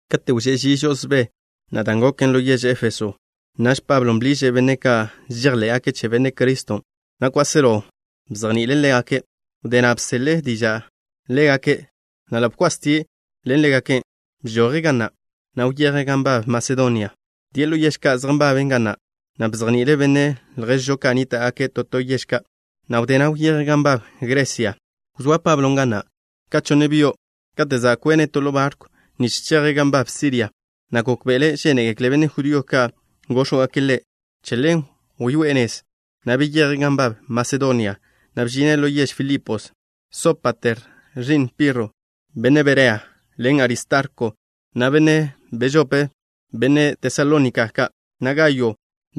Kate' wžé' ži žo'osbé na' dan' goken ḻo yež Éfeso, naž Pablo bḻiže' benne' ka' žejḻé'gake' che Benne' Criston', na' kwáselo bzejni'ile' ḻégake'. Wdé na' bzele' diža' ḻégake', na' ḻa' bkwastie' ḻen ḻégake'. Bžoje' ga na', na' wyeje' gan nbab Masedonia. Wdíe' ḻo yež ka' zej nbaben ga na', na' bzejni'ile' benne' lježžo ka' nníta'gake' to to yež ka', na' wdé na' wyeje' gan nbab Gresia. Wzóa Pablon' ga na' ka chonne byo'. Kate' za' kwene' to ḻo barkw nich cheje' gan nbab Siria, na' gókbe'ele' žénegekle benne' judío ka' góx̱wgake' ḻe'. Che ḻen wyoé'e nez, na' beyeje' gan nbab Masedonia, na' bžine' ḻo yež Filipos. Sópater, ẕi'n Pirro, benne' Berea, ḻen Aristarko, na' Segundo, benne' Tesalónika ka', na' Gayo,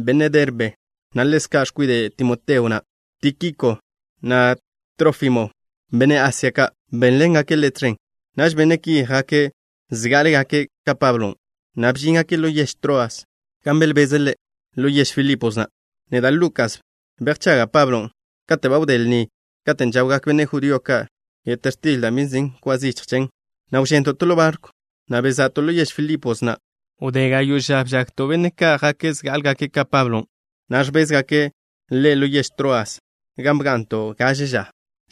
benne' Derbe, na' ḻezka' x̱kwide' Timoteo, na' Tíkiko, na' Trófimo, benne' Asia ka', bénḻengake' ḻe' tẕen. Naž benne' ki jake' zgá'alegake' ka Pablon', na' bžíngake' ḻo yež Troas, gan belbeze' ḻe'. Ḻo yež Filipos na', neda', Lukas, bejchaga' Pablon'. Kate' ba wdé lnin' kate' žawgak benne' judío ka' yet x̱til da' bi nzin' kwa zichj chen, na' wžento' to ḻo barkw, na' beza'to' ḻo yež Filipos na'. Wdé gayo' ža bžagto' benne' ka' jake' zgá'alegake' ka Pablon', na' ẕbézgake' ḻe' ḻo yež Troas, gan bga'nto' gaže ža.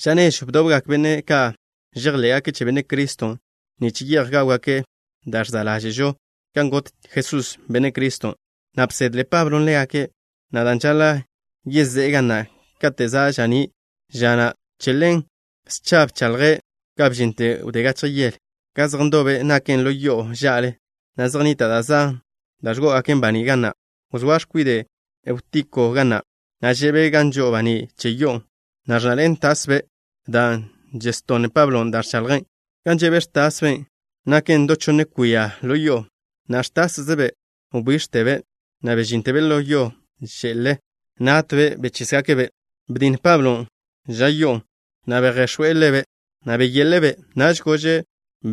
Ža nežw bdobgak benne' ka' žejḻé'gake' che Benne' Criston' nich ye'j gáwgake' da' žsa' ḻáže'žo kan got Jesús, Benne' Criston'. Na' bsedle Pablo ḻégake', na' dan' žaḻa' yezé'e ga na' kate' za' ža'ní' ža na', che ḻen scha bchaḻje', ga bžinte wdé gachje yele. Gan zej ndobe' naken ḻo yo'o ža'le, na' zej nnita' da' zan da' ẕgó'ogaken baní' ga na'. Wzóa x̱kwide' Eutiko ga na', na' že'be' gan žo'o baní' che yo'on', na' ẕnnaḻe'en tasbe' dan' ẕtonn Pablon' da' ẕchaḻje'. Gan že' ẕtas x̱kwiden' naken da' chonne kwia ḻo yo'on', na' ẕtászebe' wbíx̱tebe', na' bžíntebe' ḻo yo že'le. Náttebe' bechísgake'-be'. Betj Pablon' ẕan yo'on', na' bejx̱óe' ḻebe', na' beyeḻe'e-be'. Naž gože'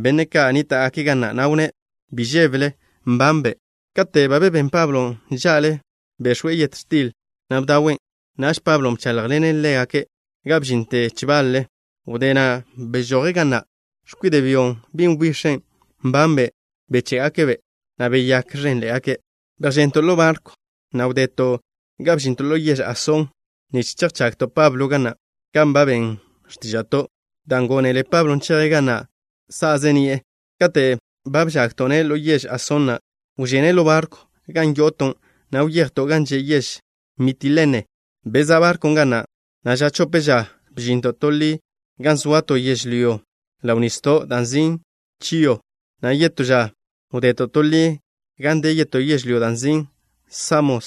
benne' ka' nníta'gake' ga na', na' wnné': —Bi žébele. Nbanbe'. Kate' ba bebén Pablon' ža'le, bex̱we' yet x̱til, na' bdawen'. Naž Pablon' bcháḻjḻene' ḻégake' ga bžinte chbal-le. Wdé na' bežoje' ga na'. X̱kwide' byon', bin' wbix̱be', nbanbe' beché'gake'-be', na' beyák ẕénḻe'egake'. Bejchento' ḻo barkw, na' wdeto' ga bžinto' ḻo yež Asón nich chejchagto' Pablo ga na', kan ba ben x̱tíža'to', dan' gónele Pablon' cheje' ga na' sa'ze ni'e. Kate' ba bžagto'-ne' ḻo yež Asón na', wžene' ḻo barkwn' gan yo'oto', na' wyejto' gan že' yež Mitilene. Bezá' barkwn' ga na', na' ža chope ža bžinto' to ḻi gan zoa to yežlyó ḻo nisdon' da' nzin' Chio, na' yetó ža wdeto' to ḻi gan de yetó yežlyó da' nzin' Samos,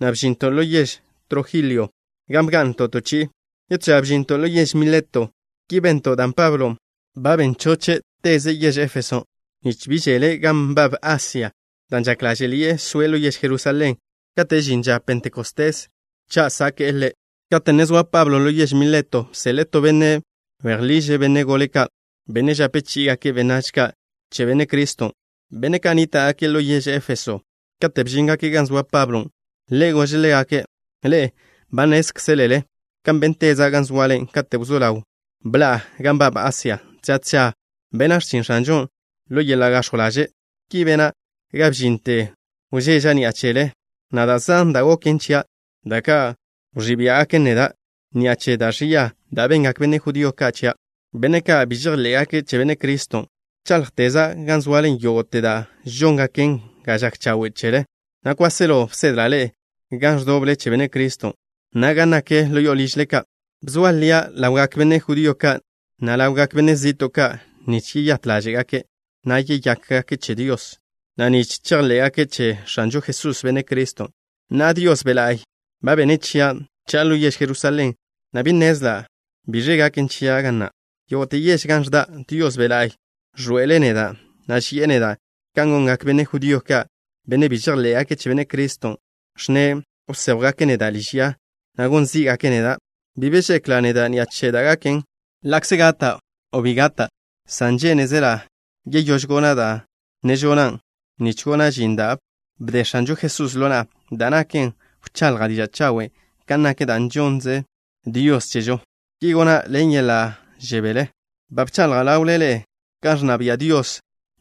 na' bžinto' ḻo yež Trojilio gan bga'nto' to chi'i. Yetó ža bžinto' ḻo yež Mileto. Ki bento' dan' Pablon' ba ben choche' teze' yež Éfeso, nich bi žele' gan nbab Asia, dan' žak ḻáže'ḻi'e soe' ḻo yež Jerusalén kate' žin ža Pentecostés cha' sáke'le'. Kate' ne zoa Pablo ḻo yež Mileto, bseḻe'e to benne' bejḻiže' benne' gole ka', benne' žape chí'igake' benách ka' che Benne' Criston', benne' ka' nníta'gake' ḻo yež Éfeso. Kate' bžíngake' gan zoa Pablon', ḻe' gože' ḻégake': —Ḻe'e ba nnézkzelele kan bénteza' gan zoale kate' wzó ḻaw bḻa'a gan nbab Asia. Tža tža bena' x̱chin X̱anžon' ḻo yeḻa' gax̱jw ḻaže'. Ki bena' ga bžinte wžeža' ni'a chele, na' da' zan da' goken chia' da' ka' wẕí' biá'gaken neda' ni'a che da' ẕia da' bengak benne' judío ka' chia', benne' ka' bi žejḻé'gake' che Benne' Criston'. Bcháḻjteza' gan zoale yógo'te da' žóngaken ga žak chawe' chele, na' kwáselo bsedla' ḻe'e gan ẕdóbele che Benne' Criston', na' gan nak ḻo ližle ka'. Bzoa lia' ḻawgak benne' judío ka', na' ḻawgak benne' zi'to' ka', nich yeyát ḻáže'gake', na' yeyákgake' che Dios, na' nich chejḻé'gake' che X̱anžo Jesús, Benne' Criston'. Na'a, Dios Be' La'y ba bene' chia' cha'a ḻo yež Jerusalén, na' bi nnezla' biẕ gaken chia' ga na'. Yógo'te yež gan ẕda', Dios Be' La'y ẕḻoe'ele' neda', na' ži'e neda' kan gongak benne' judío ka', benne' bi žejḻé'gake' che Benne' Criston', ẕnne' wséjwgake' neda' liž ya, na' gon zí'gake' neda'. Bi be žekla' neda' ni'a che da' gaken, ḻa'kze gata' o bi gata', san žénezela' yeyóž gona' da' ne žona', nich gona' žin da' bde X̱anžo Jesús ḻo na'a, da' naken wchaḻja' diža' chawen' kan nak da' žonnze Dios chežo. Ki gona' ḻen yeḻa' žebél. ’Ba bchaḻja' ḻawle ḻe'e kan ẕnna bia' Dios.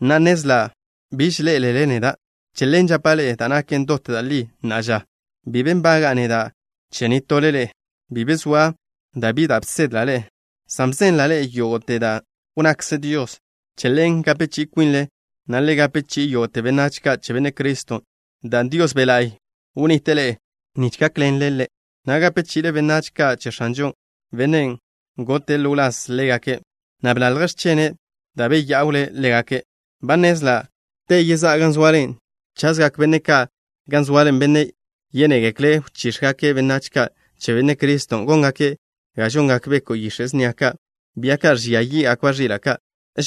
Na'a, nnezla' biž ḻé'elele neda'. Che ḻen, žapa' ḻe'e da' naken dot da' li na'a ža. Bi be nbaga'a neda' che nitole ḻe'e. Bi be zoa da' bi bsedla' ḻe'e, san bzenla' ḻe'e yógo'te da' wnnakze Dios. Che ḻen, le gape chi'i kwinle, na' le gape chi'i yógo'te benách ka' che Benne' Criston', dan' Dios Be' La'y bnnite' ḻe'e nich gákḻenle, na' gape chi'ile benách ka' che X̱anžo, Bennen' gote' ḻo wláz ḻégake', na' bḻalje' x̱chene' da' beyá'wle' ḻégake'. Ba nnezla', te yezá'a gan zoale, chazgak benne' ka' gan zoale, benne' yénegekle' wchíx̱gake' benách ka' che Benne' Criston'. Góngake' kan žongak beko' yix̱e' snia ka', bia ka' ẕbia yí'gakba' ẕila' ka'.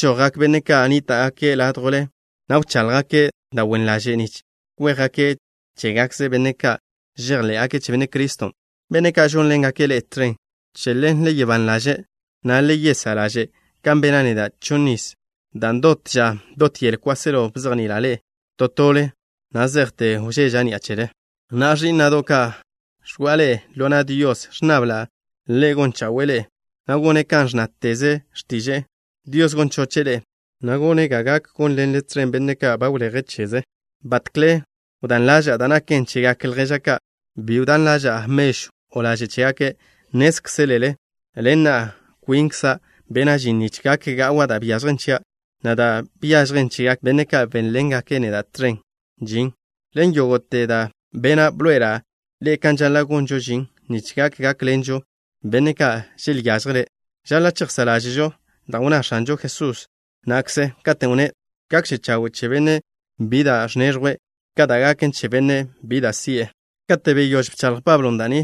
Žojgak benne' ka' nníta'gake' ládjwle, na' wcháḻjgake' da' wen ḻaže' nich kwéjgake' chégakze' benne' ka' žejḻé'gake' che Benne' Criston', benne' ka' žónḻengake' ḻe'e tẕen. Che ḻen, le gak ban ḻaže', na' le yesá' ḻaže' kan bena' neda' chonniz, dan' dot ža dot yele kwáselo bzejni'ila' ḻe'e to tole na' zejte wžeža' ni'a chele. ’Na'a, ẕí'na'do' ka', ẕgo'a ḻe'e ḻo na' Dios. Ẕnnabla' Ḻe' gon chawe'e ḻe'e, na' gone' kan ẕnna x̱tiže'e. Dios gon choche' ḻe'e, na' gone' ga gak gónḻenle tẕen benne' ka' ba wleje' cheze'. Batkle wdán ḻaža'a da' naken chegak lježa' ka'. Bi wdán ḻaža'a mežw, o laže' chégake'. Nnézkzelele, ḻen na' kwinkza' bena' žin nich gak ga'wa' da' byažjen chia', na' da' byažjen chegak benne' ka' bénḻengake' neda' tẕen žin. Ḻen yógo'te da' bena', bḻoe'ela' ḻe'e kan žaḻa' gonžo žin nich gak gákḻenžo benne' ka' želyážjele'. Žaḻa' chejsá' ḻáže'žo dan' wnná X̱anžo Jesús na'kze, katen' wnné': “Gakže chawe' che bennen' bi da' ẕneẕjwe' ka da' gaken che bennen' bi da' ẕzi'e.” Kate' beyóž bchaḻj Pablon' da' ni,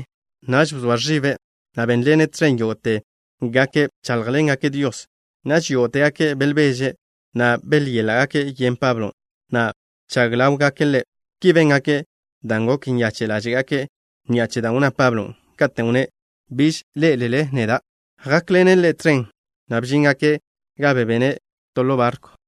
naž bzoa ẕibe', na' bénḻene' tẕen yógo'tegake', bcháḻjḻengake' Dios. Naž yógo'tegake' belbeže', na' byéḻa'gake' yen Pablon', na' bchag ḻáwgake' ḻe'. Ki béngake' dan' gok nyache' ḻáže'gake' ni'a che dan' wnná Pablon', katen' wnné': “Biž ḻé'elele neda'.” Jákḻene' ḻe' tẕen, na' bžíngake' ga bebene' ḻe' ḻo barkw.